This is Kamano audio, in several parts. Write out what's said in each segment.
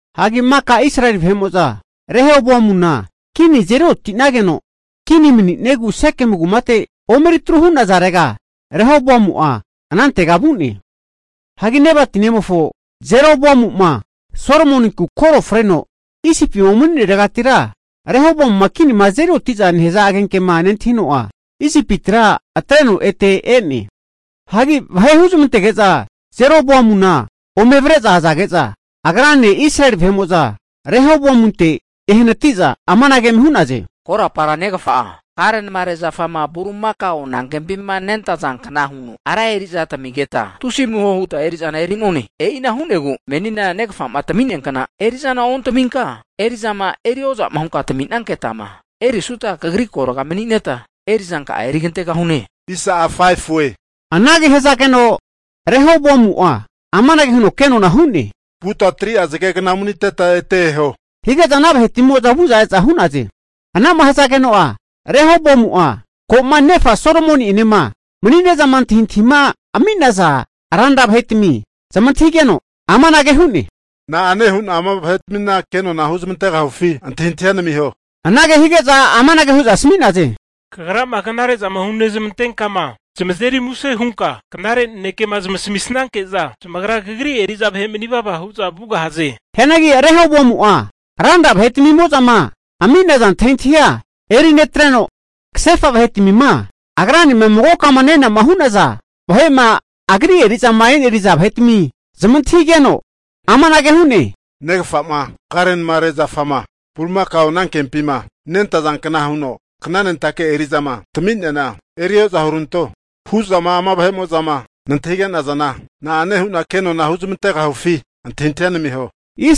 Hagi maka Israeli vahe'mo'za Rehoboamuna kini azeri oti'nageno kini mani'niegu Sekemu kumate omeri atru hu'nazarega, Rahoboamu'a anantega vu'ne. Hagi Nebati nemofo Jeroboamu'ma Solomoninku koro freno Isipima umani'neregatira Rehoboamuma kinima azeri oti'za nehaza agenkema nentahino'a, Isipitira atreno ete e'ne. Hagi vahe huzmantege'za Jeroboamuna ome avre'za azage'za, agrane Israeli vahe'mo'za Rehoboamunte ehanati'za amanage eme hu'naze, korapara negafa'a karenamare zafama bulimakao anankempima nentazankna huno ra eri'za tamigeta tusi amuho huta eri'zana eri'none. E'ina hu'negu menina negafa'ma tami'nea kna eri'zana ontaminka, eri'zama erioza'ma hunka tami'nanketama erisuta kagri kagorga mani'neta eri'zanka'a erigantegahune. Anage hazageno Rehoboamu'a amanage huno kenona hu'ne, vuta 3'a zagegna umaniteta ete eho, hige'za ana vahetmimo'za vu'za e'za hu'naze. Ana'ma hazageno'a, Rehoboamu'a ko'ma nefa Solomoni'enema mani'nezama antahintahima ami'naza ranra vahetami zamantahigeno amanage hu'ne, na'ane hu'na ama vahetmina kenona huzmantegahufi antahintahia namiho? Anage hige'za amanage hu'za asmi'naze, kagrama knare'zama hunezmantenkama, zamazeri muse hunka knare nanekema zamasamisanke'za, zamagra kagri eri'za vahe manivava hu'za vugahaze. Hianagi Rehoboamu'a ranra vahetmimo'zama ami'naza antahintahia eri netreno, kasefa vahetmima agranema magoka nenama hu'naza vahe'ma agri eri'zama e'neriza vahetami zamantahigeno, amanage hu'ne, negafa'ma karenamare zafama bulimakao anankempima nentazankna huno knanentake eri'zama tami'neana eri ozahuranto hu'zama ama vahe'mo'zama nantahige'nazana, na'ane hu'na kenona huzmantegahufi antahintahia namiho?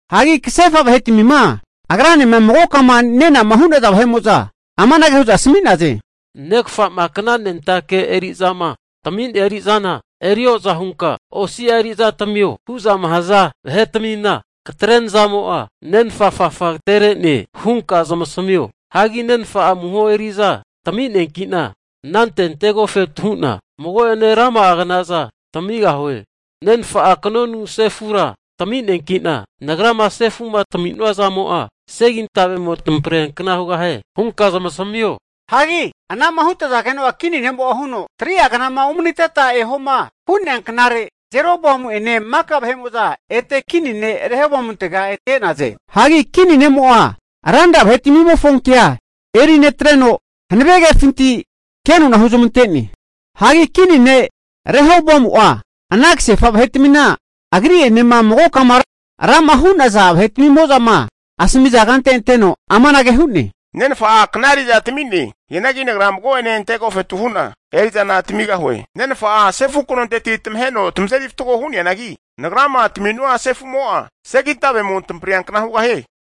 Hagi anante kasefa vahetamima agranema magokama nenama hu'naza vahe'mo'za amanage hu'za asami'naze, negafa'ma knanentake eri'zama tami'nea eri'zana eri o'za hunka osi'a eri'za tamio, hu'zama haza vahetamina, katre nazamo'a nenfa afafa agatere'ne hunka zamasamio. Hagi nenfa'a amuho eri'za tami'neanki'na anante antegofetu hu'na mago'ene rama'a knaza tamigahue. Nenfa'a kanonu sefura tami'neanki'na, nagrama sefu'ma tami'nua zamo'a segintavemo tamampriankna hugahie hunka zamasamio. Hagi ana'ma hutazageno'a kini ne'mo'a huno, 3'a knama umaniteta ehoma hu'nea knare Jeroboamu'ene maka vahe'mo'za kini ne' Rehoboamuntega ete e'naze. Hagi kini ne'mo'a ranra vahetmimofo kea eri netreno, hanavegefinti kenona huzmante'ne. Hagi kini ne' Rehoboamu'a ana kasefa vahetmima agri'enema magokama rama hu'naza vahetmimo'zama asamiza kante anteno amanage hu'ne, nenfa'a kna eri'za tami'ne. Hianagi nagra mago'ane ante agofetu hu'na eri'zana tamigahue. Nenfa'a sefu kanonteti tamaheno tamazeri fatgo hu'neanagi, nagrama tami'nua sefu'mo'a segintavemo tamampriankna hugahie.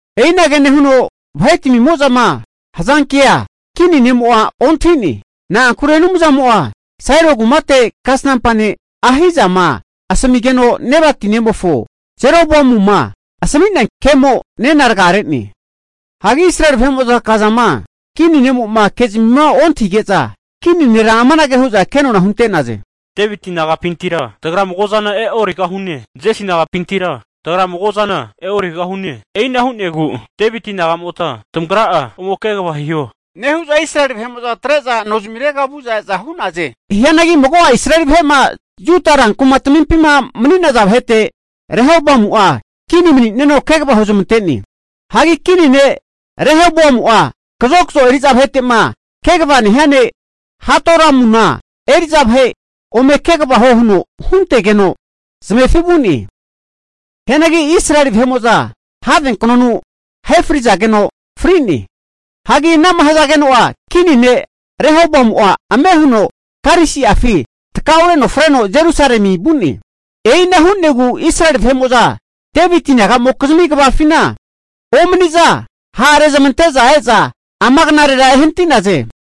E'inage nehuno vahetmimo'zama hazankea kini ne'mo'a ontahi'ne. Na'ankure Anumzamo'a Silo kumate kasnampa ne' Ahijama asamigeno, Nebati nemofo Jeroboamuma asami'nea kemo nena rgare'ne. Hagi Israeli vahe'mo'za kazama kini ne'mo'ma kezmima ontahige'za kini nera amanage hu'za kenona hunte'naze, Deviti nagapintira tagra mago'zana e'origahune! Jesi nagapintira tagra mago'zana e'origahune. E'ina hu'negu Deviti nagamota tamagra'a ome kegava hiho, nehu'za Israeli vahe'mo'za atre'za nozmirega vu'za e'za hu'naze. Hianagi mago'a Israeli vahe'ma Juda rankumatamimpima mani'naza vahete, Rehoboamu'a kini mani'neno kegava huzmante'ne. Hagi kini ne' Rehoboamu'a kazokzo eri'za vahete'ma kegava nehia ne' Hadoramuna eri'za vahe ome kegava huo huno huntegeno zamefi vu'ne. Hianagi Israeli vahe'mo'za havenknonu ahe frizageno fri'ne. Hagi anama hazageno'a kini ne' Rehoboamu'a ame huno karisi'afi takaureno freno Jerusalemi vu'ne. E'ina hu'negu Israeli vahe'mo'za, Deviti nagamokizmi kvafina omani'za hara rezmanteme e'za ama knarera ehanati'naze.